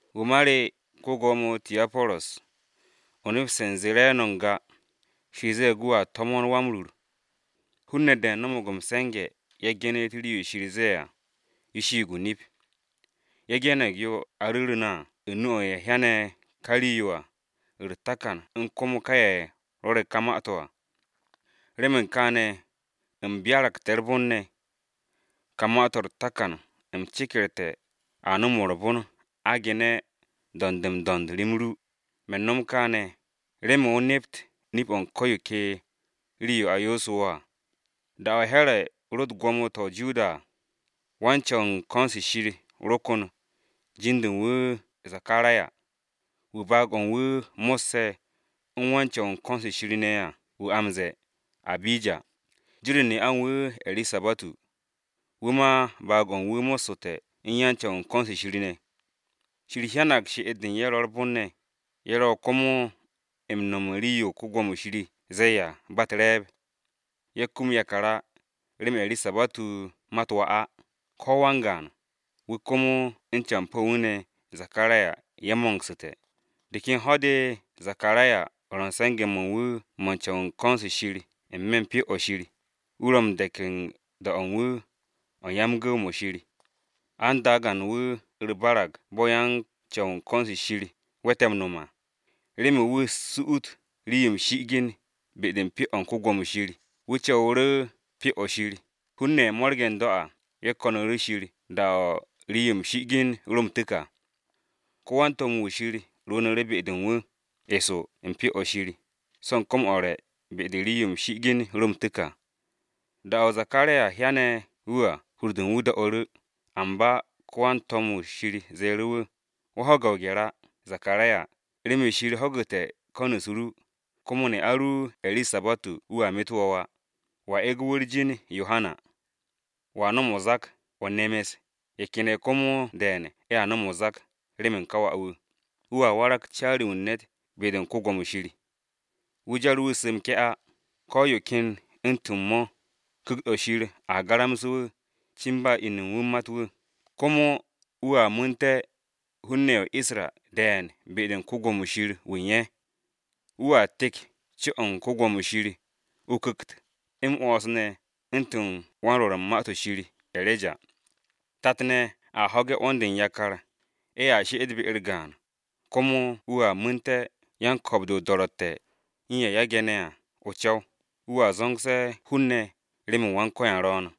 Wu̱ ma re, ko-Gwo̱mo Tiyaporus, o nepste̱ u̱n zee re̱e̱no̱ n-ga, Shir ze̱e̱g wu̱a to̱mo̱n Wa-m-Rur. Hun-ne̱ de̱e̱n no̱mo̱g m-se̱nge̱ ye̱ ge̱ne̱g rii-yo Shir ze̱e̱ à, yo shiig o-nip. Ye̱ ge̱ne̱g yo a ru̱ru̱ na à u̱n nu-o̱ u̱n ye̱ hyane̱ ka rii-yo à, u̱r-takan u̱n komo ka ye̱ rwo̱re̱ ka ma-to̱ à. Remen kaane̱ u̱m byaragte̱ u̱r-bon ne̱, ka ma-to̱ ne̱ u̱r-takan u̱m cekerte̱ a nom u̱r-bon a ge̱n m-do̱nd m-do̱nd rem ru. Me̱n no̱m kaane̱, remen o nept nip-o̱ u̱n ko̱ yo ke rii-yo a yoosu̱ wo̱ à. Da-o̱ Here̱ ro u̱t-gwo̱mo to̱ u̱n dak-o̱ o-Judiya à, wan-Co̱w u̱n ko̱n-se Shir ro kon, jin-de u̱n wu̱ Zakaraya, wu̱ baag-o̱ u̱n wu̱ mo̱sse̱ u̱n wan-Co̱w u̱n ko̱n-se Shir ne̱ à wu̱ a m-ze̱e̱, Abija. Jin-u̱r ne'a u̱n wu̱ Erisabatu, wu̱ ma baag-o̱ u̱n wu̱ mo̱ssu̱te̱ u̱n yan-Co̱w u̱n ko̱n-se Shir ne̱. Shir hyanag she'et-de u̱n ye̱ ro̱ u̱r-bon ne̱, ye̱ ro komo m-no̱m u̱n rii-yo Wan-Ko̱yan ze̱e̱ à, ba u̱t-re̱e̱b. Ye̱ kum yakar á, remen Erisabatu mat wà á, ko̱ wan-gaan, wu̱ komo u̱n campo̱ u̱n wu̱ ne̱ Zakaraya ye̱ mo̱ngsu̱te̱. De ken ho̱-de Zakaraya ro̱ u̱n se̱nge̱-mo̱ u̱n wu̱ mo̱ u̱n yan-Co̱w u̱n ko̱n-se Shir n-me̱ u̱n Pyo-o̱ Shir, wu̱ ro̱ m-de̱k u̱n da-o̱ u̱n wu̱ o̱ u̱n gu̱w-mo̱ Shir. An dagan wu̱ u̱r-barag bo̱ yan-Co̱w u̱n ko̱n-se Shir we̱te̱ m-no̱m à, remen wu̱ su'ut rii-yo m-shi'igin be-de u̱n Pyo-o̱ u̱n Wan-Ko̱yan. Wu̱ co̱wu̱ru̱ u̱n Pyo-o̱ Shir, hun-ne̱ ye̱ mo̱rge̱ n-do̱ à, ye̱ ko̱nu̱ru̱ Shir da-o̱ rii-yo m-shi'igin ro m-tu̱k à. Wan-to̱m-wu̱ Wan-Ko̱yan rwu̱u̱nu̱ru̱ be-de u̱n wu̱, eso u̱n Pyo-o̱ Shir, so̱ u̱n kom-o̱ u̱r-re̱ be-de rii-yo m-shi'igin ro m-tu̱k à. Da-o̱ Zakaraya hyane̱ wu̱ à, hur-u̱r do̱'u̱ru̱ wu̱, amba wan-to̱m-wu̱ Shir ze̱e̱ru̱ wu̱, “Zakaraya, wo̱ ho̱ge̱ o-gye̱r á! Remen Shir ho̱gu̱te̱ ko̱n-u̱s ru, komo ne'a ru Erisabatu wu̱a metu̱ wo̱ wà. Wo̱a ege̱ wu̱ u̱r-jin ‘Yohana.’ Wo̱a nom o-zak, o nemes, ye̱ ken ye̱ komo de̱e̱n a nom o-zak, remen ka wà-wu̱! Wu̱a warag caari-wu̱ u̱n ne̱t be-de Wan-Ko̱yan. Wu̱ jar wu̱ su̱ m-ke̱ á, ko̱ yo ken yo u̱ntu̱n mo̱ á. Ku̱kt-o̱ Shir a garamse̱ wu̱, cin ba inu u̱n wu̱ mat wu̱, komo wu̱a mu̱nte̱ hun-ne̱ ye̱ o-Isra de̱e̱n be-de u̱n ko-Gwo̱mo Shir wu̱ u̱n ye̱. Wu̱a tek co-o̱ u̱n Wan-Ko̱yan, o-ku̱kt, m-'wo̱ns ne̱ u̱ntu̱n wan-Rwo̱r u̱n Ma-to̱ ShirE̱reja. Tat-ne̱ a ho̱ge̱ 'wo̱n-de u̱n yakar, ye̱ she'et be-u̱r gaan, komo wu̱a mu̱nte̱ yan-ko̱o̱b-de o-do̱ro̱tte̱, u̱n ye̱ e̱ge̱ ne̱ à o-co̱w, wu̱a zo̱ngse̱ hun-ne̱ remen Go̱s-wu̱ ro̱o̱n.”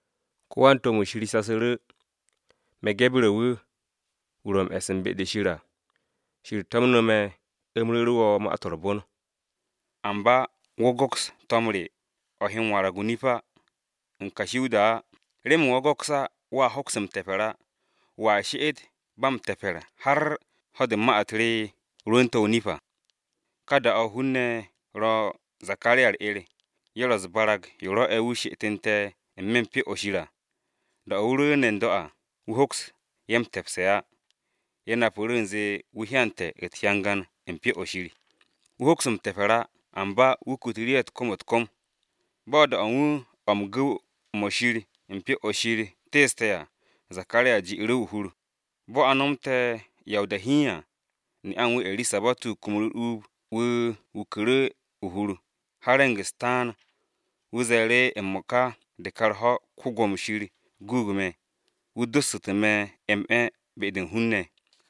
Ko wan-to̱m-wu̱ Shir shasu̱ru̱, “Me̱ Gebu̱re̱ wu̱, wu̱ ro̱ m-e̱s u̱n be-de Shir à. Shir to̱mne̱ me̱, u̱m ru̱ru̱ wo̱ Ma-to̱ m-Re̱re̱m. Amba wo̱ go̱ks to̱m re o̱ he m-warag o-nip á, u̱n kashi o-da á. Remen wo̱ go̱ks á, wo̱a hoks m-te̱pe̱r á, wo̱a she'et ba m-te̱pe̱r har ho̱-de ma-u̱t re rwu̱u̱nte̱ o-nip à.” Ka da-o̱, hun-ne̱ ro̱ Zakaraya u̱r-'er. Ye̱ ro̱ u̱s-barag yo rwo̱'e̱ wu̱ she'etu̱nte̱ n-me̱ u̱n Pyo-o̱ Shir à. Da-o̱ wu̱ rwu̱u̱ne̱ n-do̱ à, wu̱ hoks ye̱ m-te̱pse̱ á, ye̱ napu̱ru̱ u̱nze wu̱ hyante̱ u̱t-hyangan u̱n Pyo-o̱ Shir. Wu̱ hoks m-te̱pe̱r á, amba wu̱ kutu̱ru̱ ye̱ u̱t-kom u̱t-kom. Bo̱ da-o̱ u̱n wu̱ o̱ u̱n gu̱w-mo̱ Shir u̱n Pyo-o̱ Shir teeste̱ à, Zakaraya ji'u̱ru̱ o-hur. Bo̱ a nomte̱ ya o-da hiin à, ne'a u̱n wu̱ Erisabatu kumu̱ru̱ u̱r-uub wu̱ wuku̱ru̱ o-hur, har re̱ng-u̱s taan. Wu̱ ze̱e̱ru̱, “M-mo̱ka de ka u̱r-ho̱, Wan-Ko̱yan guug me̱. Wu̱ dossu̱te̱ me̱ m-'e̱ be-de u̱n hun-ne̱!”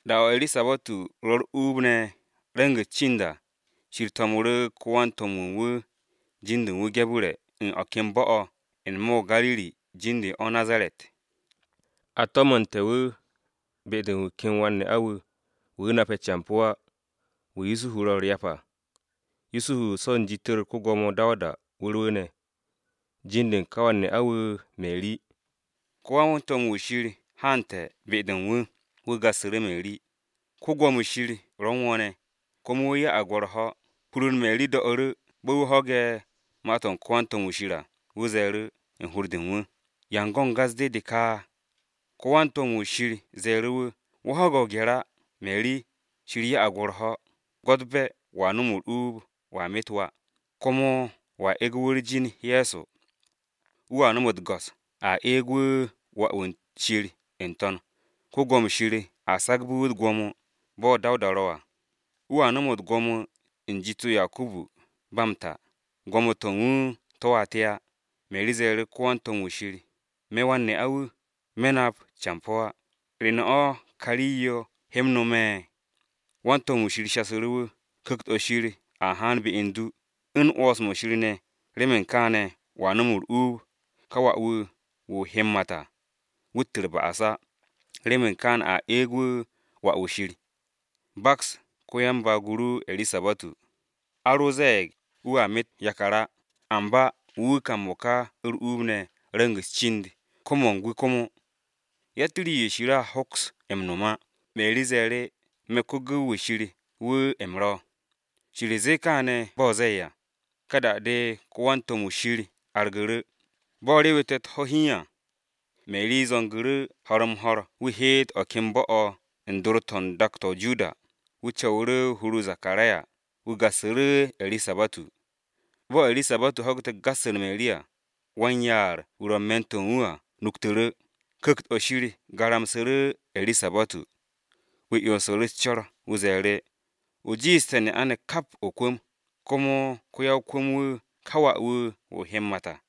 Da-o̱ Erisabatu ro u̱r-uub ne̱ re̱ng-u̱s cind à, Shir to̱mnu̱ru̱ wan-to̱m-wu̱ u̱n wu̱ jin-de u̱n wu̱ Gebu̱re̱ u̱n o̱ ken bo̱-o̱ n-me̱ o-Gariri jin-de u̱n o̱, o-Nazaret. A to̱mu̱nte̱ wu̱ be-de u̱n wu̱ ken wan-ne'a-wu̱, wu̱ nape̱ campo̱ á, wu̱ Yusuhu ro u̱r-ryap à. Yusuhu co̱ u̱n jit-u̱r ko-Gwo̱mo Dawuda wu̱ rwu̱u̱ne̱. Jin-de u̱n ka wan-ne'a-wu̱ Meri. Ko wan-to̱m-wu̱ Shir haante̱ be-de u̱n wu̱. Wu̱ gassu̱ru̱ Meri, “Wan-Ko̱yan ro̱ u̱n wo̱ ne̱, komo wu̱ ya'ag wo̱ u̱r-ho̱!” Hur-u̱r Meri do̱'u̱ru̱ wu̱ bo̱ wu̱ ho̱ge̱ ma-to̱ u̱n ko-wan-to̱m-wu̱ Shir à, wu̱ ze̱e̱ru̱, u̱n hur-de u̱n wu̱, “¿Ya u̱n go̱n gas-de ne̱ de ka?” Ko wan-to̱m-wu̱ Shir ze̱e̱ru̱ wu̱, “Meri, wo̱ ho̱ge̱ o-gye̱r á! Shir ya'ag wo̱ u̱r-ho̱! Gwo̱tbe̱ wo̱a nom u̱r-uub, o met wà, komo wo̱a ege̱ wu̱ u̱r-jin Ye̱so. Wu̱a nom u̱t-go̱s, a eeg wu̱, wà-wu̱ u̱n Shir n-To̱n. Wan-Ko̱yan Shir a sagbe̱ wu̱ u̱t-gwo̱mo, bo̱ Dawuda ro à, wu̱a nom gwo̱mo-to̱ u̱n jit-o Yakubu ba m-ta, gwo̱mo-to̱ u̱n wu̱ to̱a te á!” Meri ze̱e̱ru̱ ko-wan-to̱m-wu̱ Shir, “Me̱ wan-ne'a-wu̱, me̱ nap campo̱ á. ¿Re ne̱ o̱ ka rii-yo he m-nome̱?” Wan-to̱m-wu̱ Shir shasu̱ru̱ wu̱, “Ku̱kt-o̱ Shir a haan be u̱n du, u̱n 'wo̱ns-mo̱ Shir ne̱ n-To̱n, remen kaane̱ wo̱a nom u̱r-uub. Ka wà-wu̱, wu̱ o he m-mat à, wu̱t u̱r-ba'as á, remen kaane̱ a eeg wu̱ wà-wu̱ u̱n Shir. Baks ko-yan-baag-o ru Erisabatu. A ro ze̱e̱g wu̱a met yakar á, amba wu̱ ka m-mo̱ka u̱r-uub ne̱ re̱ng-u̱s cind, ko-mo̱ng-wu̱ komo. Yatt rii-yo Shir a hoks m-no̱m á.” Meri ze̱e̱ru̱, “Me̱ ko-gu̱w-wu̱ Wan-Ko̱yan wu̱ u̱m ro̱, Shir zee kaane̱ bo̱ o ze̱e̱ à.” Ka da-de wan-to̱m-wu̱ Shir argu̱ru̱. Bo̱ rewete̱ u̱t-ho̱ hiin à, Meri zo̱ngu̱ru̱ ho̱r-m-ho̱r wu̱ heet o̱ ken bo̱-o̱ u̱n dor-to̱ u̱n dak-o̱ o-Judiya. Wu̱ co̱wu̱ru̱ hur-o Zakaraya, wu̱ gassu̱ru̱ Erisabatu. Bo̱ Erisabatu ho̱gu̱te̱ gas-u̱r Meri à, wan-yaar-wu̱ ro̱ u̱n me̱n-to̱ u̱n wu̱ à nuktu̱ru̱. Ku̱kt-o̱ Shir garamsu̱ru̱ Erisabatu. Wu̱ 'yonsu̱ru̱ u̱s-co̱r wu̱ ze̱e̱ru̱, “O jiishte̱ ne'a-ne̱ kap o-kwu̱m, komo ko-ya-o-kwu̱m-wu̱ ka wà-wu̱ o he m-mat à!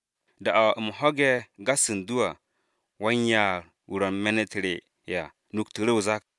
Da-o̱ u̱m ho̱ge̱ gas u̱n du à, wan-yaar-wu̱ ro̱ n-me̱ u̱n me̱n-u̱t re à nuktu̱ru̱ o-zak.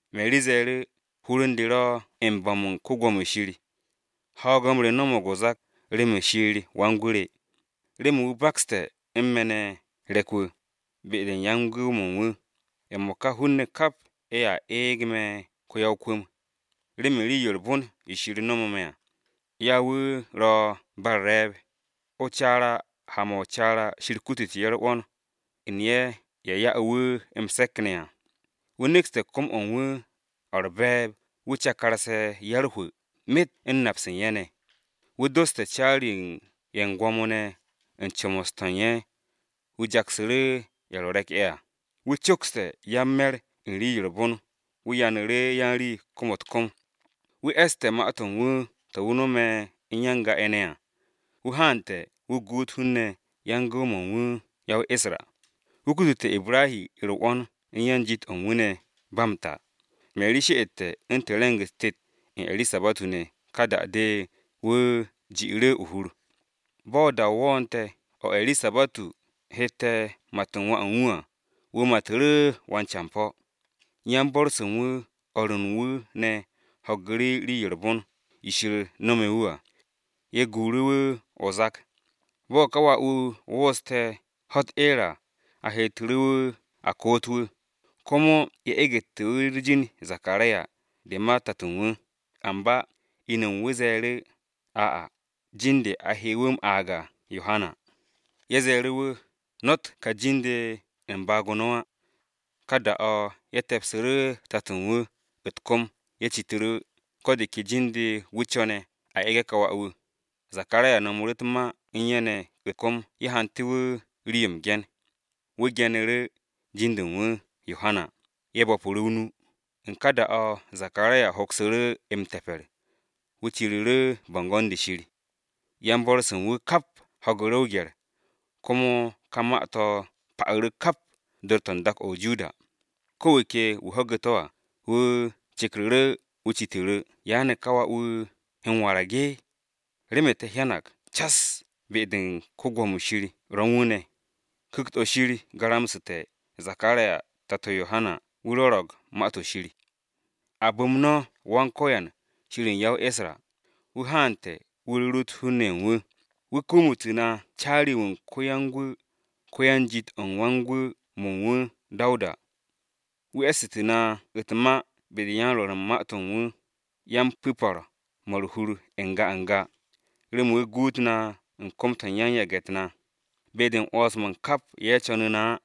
Meri ze̱e̱ru̱, “Hur u̱n de ro̱ m-bo̱m u̱n Wan-Ko̱yan. Ho̱o̱g-m re no̱mo̱g o-zak remen Shir Wan-Gwu̱ re, Remen wu̱ bakste̱ u̱n me̱ ne̱ re̱k-wu̱, be-de u̱n yan-gu̱w-mo̱ u̱n wu̱! M-mo̱ka hun-ne̱ kap ye̱a eeg me̱ ko-ya-o-kwu̱m, remen rii-yo u̱r-bon yo wu̱ jiishe̱ m-'wo̱ns nomo me̱ à. Jin-de u̱n wu̱ ro̱ ba m-ku̱ko̱p. O-caara ha-mo̱ o-caara, Shir kutute̱ ye̱ u̱r-'wo̱n, u̱n ye̱ ya'e̱ wu̱ m-se̱k ne̱ à. Wu̱ nekste̱ kom-o̱ u̱n wu̱, o̱ u̱r-be̱e̱b, wu̱ cakar-se ya-u̱r-hwu̱ myet u̱n nap-se u̱n ye̱ ne̱. Wu̱ doste̱ caari-ye̱ u̱n gwo̱mo-ne̱ u̱n comos-to̱ u̱n ye̱, wu̱ jaksu̱ru̱ ye̱ ro̱ re̱k-ye̱ à. Wu̱ cokste̱ yan-me̱r u̱n rii-yo u̱r-bon, wu̱ yanu̱ru̱ yan-rii kom-u̱t-kom. Wu̱ e̱ste̱ ma-to̱ u̱n wu̱ to̱ wu̱ no̱me̱ u̱n ya-n-ga-ye̱ ne̱ à, wu̱ haante̱ wu̱ guut hun-ne̱ yan-gu̱w-mo̱ u̱n wu̱ ya-o-Isra. Wu̱ kutute̱ Ibrahi u̱r-'wo̱n u̱n yan-jit-o̱ u̱n wu̱ ne̱ ba m-ta!” Meri she'ete̱ u̱ntu̱n re̱ng-u̱s tet u̱n Erisabatu ne̱, ka da-de wu̱ ji'u̱ru̱ o-hur. Bo̱ da-o wo̱o̱ne̱ o̱ Erisabatu hette̱ mat u̱n wà u̱n wu̱ à, wu̱ matu̱ru̱ wan-campo̱. Yan-bo̱r-se u̱n wu̱, u̱n o̱r ru u̱n wu̱ ne̱ ho̱gu̱ru̱ rii-yo u̱r-bon, yo Wan-Ko̱yan nome̱ wu̱ à, ye̱ guuru̱ wu̱ o-zak. Bo̱ ka wà-wu̱ wo̱o̱ste̱ ho̱-u̱t eer à, ye̱ heetu̱ru̱ wu̱ a koot wu̱, komo ye̱ egetu̱ wu̱ u̱r-jin Zakaraya, de ma tato u̱n wu̱. Amba inu u̱n wu̱ ze̱e̱ru̱, “Ay! Jin-de a he wu̱ m-aag à Yohana wu̱.” Ye̱ ze̱e̱ru̱ wu̱, “No̱tt ka jin-de u̱n baag-o no̱ á!” Ka da-o̱ ye̱ te̱psu̱ru̱ tato u̱n wu̱ u̱t-kom, ye̱ citu̱ru̱ wu̱ ko̱ de ke jin-de wu̱ co̱ne̱ a ege̱ ka wà-wu̱. Zakaraya nomu̱ru̱ u̱t-ma u̱n ye̱ ne̱ u̱t-kom ye̱ hante̱ wu̱ rii-yo m-ge̱n, wu̱ ge̱nu̱ru̱, “Jin-de u̱n wu̱ Yohana.” Ye̱ bo̱pu̱ru̱ o-nu! U̱n ka da-o̱ Zakaraya hoksu̱ru̱ m-te̱pe̱r, wu̱ ciru̱ru̱ bo̱ngo̱n-de Shir. Yan-bo̱r-se u̱n wu̱ kap ho̱gu̱ru̱ o-gye̱r, komo ka ma-to̱ pa'u̱ru̱ kap dor-to̱ u̱n dak-o̱ o-Judiya. Ko̱ wu̱ ke wu̱ ho̱ge̱ to̱ à, wu̱ cekru̱ru̱ wu̱ citu̱ru̱, “¿Ya ne̱ ka wà-wu̱ he m-warag? Remen te̱ hyanag cas be̱e̱b-de u̱n Wan-Ko̱yan ro̱ u̱n wu̱ ne̱.” Ku̱kt-o̱ Shir garamsu̱te̱ Zakaraya tato Yohana wu̱ rwo̱ro̱g to̱m-o̱ Shir. “A bu̱m no̱ Go̱s-wu̱, Shir wu̱ u̱n ya-o-Isra! Wu̱ haante̱ wu̱ rurut hun-ne̱ ye̱ u̱n wu̱, Wu̱ kumutu̱ na caari-wu̱ u̱n ko-yan-Gwu̱, ko-yan-jit-o̱ u̱n wan-gu̱w-mo̱ u̱n wu̱ Dawuda. Wu̱ e̱ssu̱tu̱ na u̱t-ma be-de u̱n yan-rwo̱r u̱n ma-to̱ u̱n wu̱ yan-ba-m-ku̱ko̱p-mo̱ u̱r-hur n-ga n-ga, remen wu̱ guut na u̱n kom-to̱ u̱n yan-yage̱-u̱t na, be-de u̱n 'wo̱ns-mo̱ u̱n kap ye̱ co̱nu̱ na á.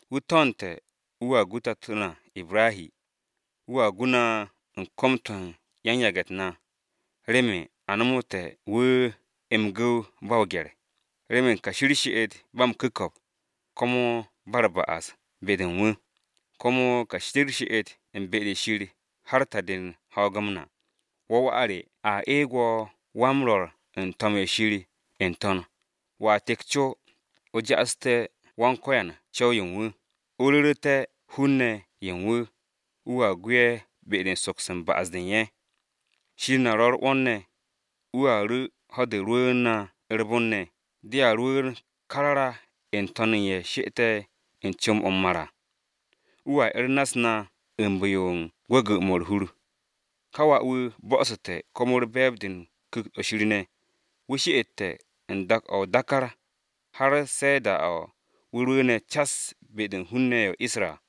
Wu̱ to̱nte̱ wu̱a gu tato na Ibrahi. Wu̱a gu na u̱n kom-to̱ u̱n yan-yage̱-u̱t na, remen a nomoté̱ wu̱ m-gu̱w ba o-gye̱r, remen kashi u̱r-she'et ba m-ku̱ko̱p, komo ba u̱r-ba'as be-de u̱n wu̱, komo kashi u̱r-she'et u̱n be-de Shir har ta-de u̱n ho̱o̱g-m na.” “Wo̱, wà re a eeg wo̱ wan-Rwo̱r u̱n Ma-to̱ Shir n-To̱n. Wo̱a tek co, o ja'asu̱té̱ Go̱s-wu̱ co̱w-yo u̱n wu̱, o ru̱ru̱te̱ hun-ne̱ ye̱ u̱n wu̱, wu̱a gu ye̱ be-de u̱n soks u̱n ba'as-de u̱n ye̱. Shir na ro̱ u̱r-'wo̱n ne̱. Wu̱a ru̱ ho̱-de rwu̱u̱n na u̱r-bon ne̱ dea rwu̱u̱n karara n-to̱n u̱n ye̱ she'ete̱ u̱n comb-o̱ m-mar à, wu̱a 'er na-u̱s na u̱n bu̱-yo u̱n gwu̱gwu̱-mo̱ u̱r-hur.” Ka wà-wu̱ bo̱'o̱su̱te̱, komo u̱r-be̱e̱b de u̱n Ku̱kt-o Shir ne̱. Wu̱ she'ete̱ u̱n dak-o̱ o-dákár, har se̱ da-o̱ wu̱ rwu̱u̱ne̱ cas be-de u̱n hun-ne̱ ye̱ o-Isra.